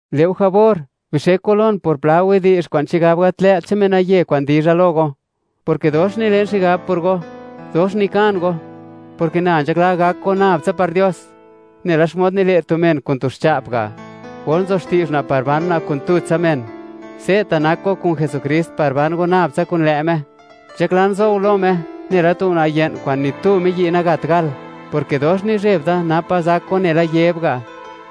Le' go jabor, bixek go lon por pla widi'zh kwa'n chigab gat lë't che'n menaye kwa'n dizha lo go, porke dox nilen xigab por go, dox nikan go, porke na nzhakla gak go nab tsa par Dios, nela xmod nile' tu men kun tu xcha'p ga', or nzo xti'zh una' par ban una' kun tutsa men. Se'ta' nak go kun Jesukrist, par ban go nab tsa kun lë' Me. Nzhaklan zo go lo Me, nela tu una' ye'n kwa'n ni tu miyi' nagat gal, porke dox nizheb da, napa zak go nela Yeb ga',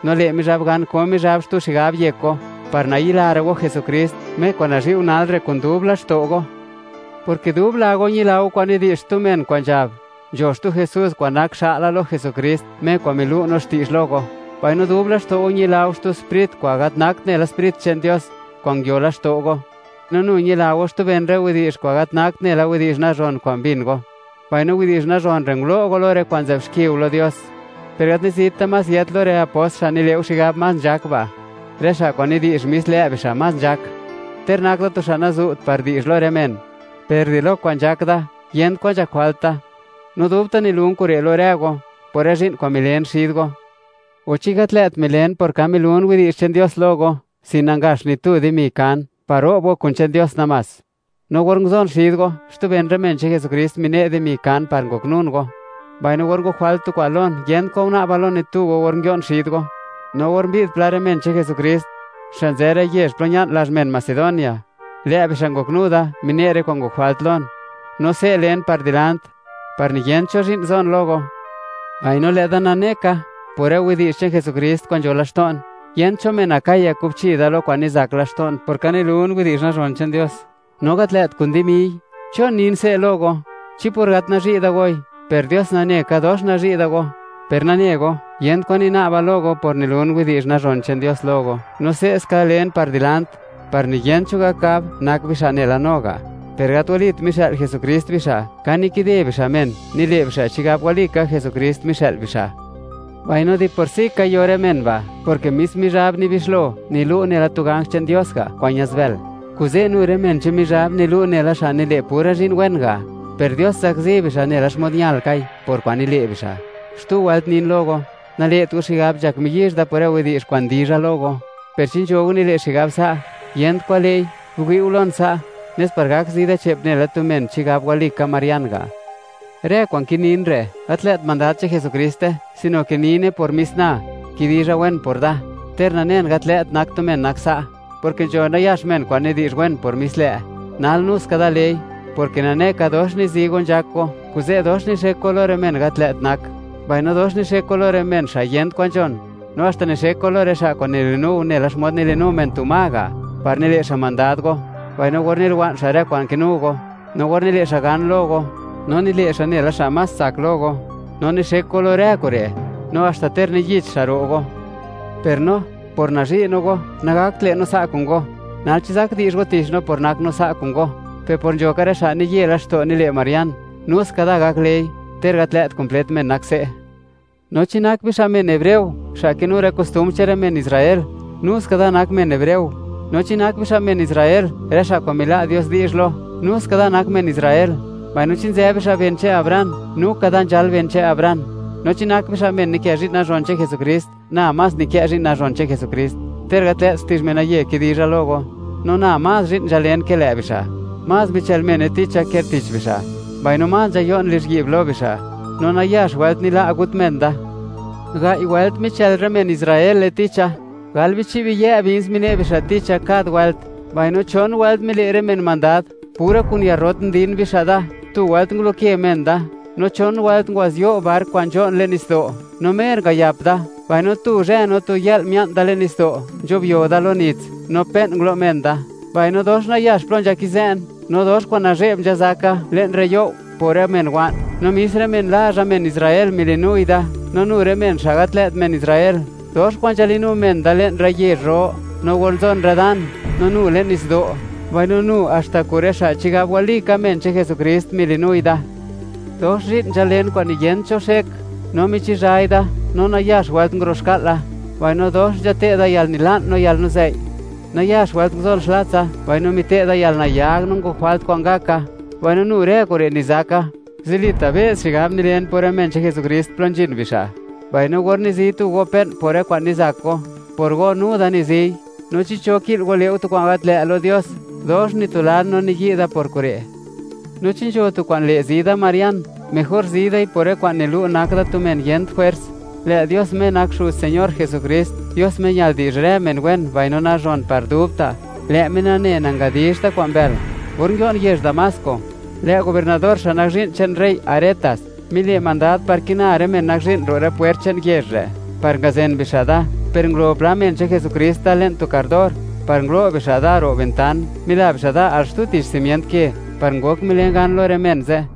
no le' Mizhab gan ko Mizhab xtu xigab yek go, par nayilara' go Jesukrist, Me kwa'n nazhi' go nal re' kun dub laxto' go, porke dub la go ñila go kwa'n nidi'zh xtu men kwa'n nzhab, nzho xtu Jesús kwa'n nak xa'la lo Jesukrist, Me kwa'n milu' no xti'zh lo go, mbaino dub laxto' go ñila go xtu sprit kwa'n gat nakt nela Sprit che'n Dios kwa'n nguio laxto' go. No nu ñila go xtu ben rë widi'zh kwa'n gat nakt nela widi'zh nazhon kwa'n mbin go, mbaino widi'zh nazhon re' ngulo' go lo rë kwa'n nzë'b xki go lo Dios. Per gat nizit da más yët lo rë apost xa' nile' go xigab más nzhak ba', rë xa' kwa'n nidi'zh, mis lë' bixa' más nzhak. Ter nak da tu xa' nazu't par di'zh lo rë men, per di lo kwa'n nzhak da, yent kwan nzhak jwalt da, no dubta' milun kure' lo rë go, por rë zhi'n kwa'n milen xid go. O, ¿chi gat lë't milen por ka milun widi'zh che'n Dios lo go, sin nangaxt ni tu dimi kan par ro'b go kun che'n Dios namás?, no or nguzon xid go, xtu ben rë men che'n Jesukrist mine' dimi kan par ngoknun go, mbaino or ngok jwalt tu kwa'n lon, yent kwan una'ba lo ni tu go or nguio'n xid go, no or mbi'd pla rë men che'n Jesukrist, xa' nzë rë yezh plo ña'n lazh men Macedonia, lë' bixa' ngoknu da, mine' rë kwa'n ngok jwalt lon, no se' len par dilant, par niyent cho zhi'n zon lo go. Mbaino, lë' da nane ka, por rë widi'zh che'n Jesukrist kwa'n nzho laxto'n, yent cho men Acaya kubchi da lo kwa'n nizak laxto'n por ka nilun widi'zh nazhon che'n Dios, no gat lë't kun dimiy. ¿Chon nin se' lo go? ¿Chi por gat nazhi' da goi? ¡Per Dios nane ka, dox nazhi' da go! Per nane go, yent kwan nina'ba lo go por nilun widi'zh nazhon che'n Dios lo go, no se'ska len par dilant, par niyent cho gak gab, nak bixa' nela no ga'. Per gat walit mixë'l Jesukrist bixa'; ka nikide bixa' men, nile' bixa' chigab walika Jesukrist mixë'l bixa'. Mbaino di por si ka, yo rë men ba', porke mis Mizhab nibixlo, nilu' nela tu ganj che'n Dios ga' kwa'n ñaz bël. Kuze', nu rë men che'n Mizhab nilu' nela xa' nile' pura zhi'n wen ga', per Dios zakzi bixa' nela xmod ñalkai por kwa'n nile' bixa'. Xtu wëlt nin lo go: Nale't go xigab, nzhak miyizh da por rë widi'zh kwa'n dizha lo go. Per chi nzho go nile' xigab sa', yent kwan lë'i, biwi' go lon sa' nes par gak zi da che'p nela tu men chigab walika marian ga'. Rë kwa'n kinin re', gat lë't mandad che'n Jesukriste, sino ke nine por mis na, kidizha wen por da, ter nanen, gat lë't nak tu men nak sa', porke nzho nayax men kwa'n nidi'zh wen por mis lë', nal nu ska da lei, porke nane ka dox nizi go nzhak go, kuze' dox nixek go lo rë men gat lë't nak, mbaino dox nixek go lo rë men xa' yent kwan nzhon. No haxta nixek go lo rë xa' kwa'n nili'nu go nela xmod nili'nu men tu ma ga', par nile' xa' mandad go, mbaino or niliwa'n xa' rë kwa'n kinu go, no or nile' xa' gan lo go, no nile' xa' nela xa' más tsak lo go, no nixek go lo rë kure'. No haxta ter niyich xa' ro' go. Per no, por nazhi' no go, nagakt le' no sa' kun go. Nal, ¿chi zak di'zh go tich no por nak no sa' kun go? Per por nzho ka rë xa' niye laxto' nile' marian, nu ska da gak lei, ter gat lë't kumplet men nak se'. No chi nak bixa' men hebreo, xa' kinu rë kostumbr che'n rë men Israel, nu ska da nak men hebreo. No chi nak bixa' men Israel, rë xa' kwa'n mila' Dios di'zh lo, nu ska da nak men Israel. Mbaino chi nzë bixa' ben che'n Abraham, nu ka da nzhal ben che'n Abraham. No, chi nak bixa' men nikë zhi'n nazhon che'n Jesukrist, na más nikë zhi'n nazhon che'n Jesukrist, ter gat lë't xti'zh menaye kidizha lo go. No na, más zhi'n nzhalen ke lë' bixa'; más michël mene ticha ke tich bixa', mbaino más nzhayo'n lizhyi'b lo bixa', no nayax wëlt nila' gut men da. Gai' wëlt, michël rë men Israele ticha; gal bichi' biyë' bins mine' bixa' ticha kad wëlt, mbaino chon wëlt mile' rë men mandad, pura kun yarrot ndin bixa' da, tu wëlt nguloke men da, no chon wëlt ngwa'zyo' bark kwa'n nzho'n le'n nitsdo', no mer ngayap da, mbaino tu zhë no tu yë'l mia'n da le'n nitsdo', nzho'byo da lo nits, no pe'n ngulo' men da. Mbaino dox nayax plo nzhakizë'n, no dox kwa'n nazhe'b nzhazaka, le'n rë you', por rë men wa'n, no mis rë men lazha men Israel mili'nui da, no nu rë men xa' gat lë't men Israel. Dox kwa'n nzhalinu men da le'n rë yezh ro no or nzon rë dan, no nu le'n nitsdo'. Mbaino nu haxta kun rë xa' chigab walika men che'n Jesukrist, mili'nui da. Dox zhi'n nzhalen kwa'n niyent cho xek, no michizhai da, no nayax wëlt nguro'xka'la, mbaino dox nzhate'da yalnila'n no yalnuzei'; nayax wëlt nguzon xlatsa, mbaino mite'da yalnayag, no ngok jwalt kwa'n ngaka. Mbaino nu rë kure' nizaka: zilita' be's xigab nilen por rë men che'n Jesukrist plo nzhin bixa'. Mbaino or nizi tu go pe'n por rë kwa'n nizak go, por go nu da niziy; no chi cho ki'l go le' go tu kwa'n gat lë' lo Dios, dox nitulan no niyi' da por kure'. No chi nzho tu kwa'n le' zi da marian, mejor zi dai por rë kwa'n nilu' nak da tu men yent jwers. Lë' Dios, Me nak Xuz Señor Jesukrist, Dios Me ñal di'zh rë men wen, mbaino nazhon par dubta'; lë' Me nane, nangadizhta' kwa'n mbël. Or nguio'n yezh Damasco, lë' gobiernador xa' nak zhi'n che'n rey Aretas, mile' mandad par kina rë men nak zhi'n ro' rë pwert che'n yezh re', par ngazen bixa' da, per ngulo pla men che'n Jesukrist da le'n tu kardor, par ngulo' bixa' da ro' ventan, mila bixa' da al xtu tich simient ke, par ngok milen gan lo rë men ze'.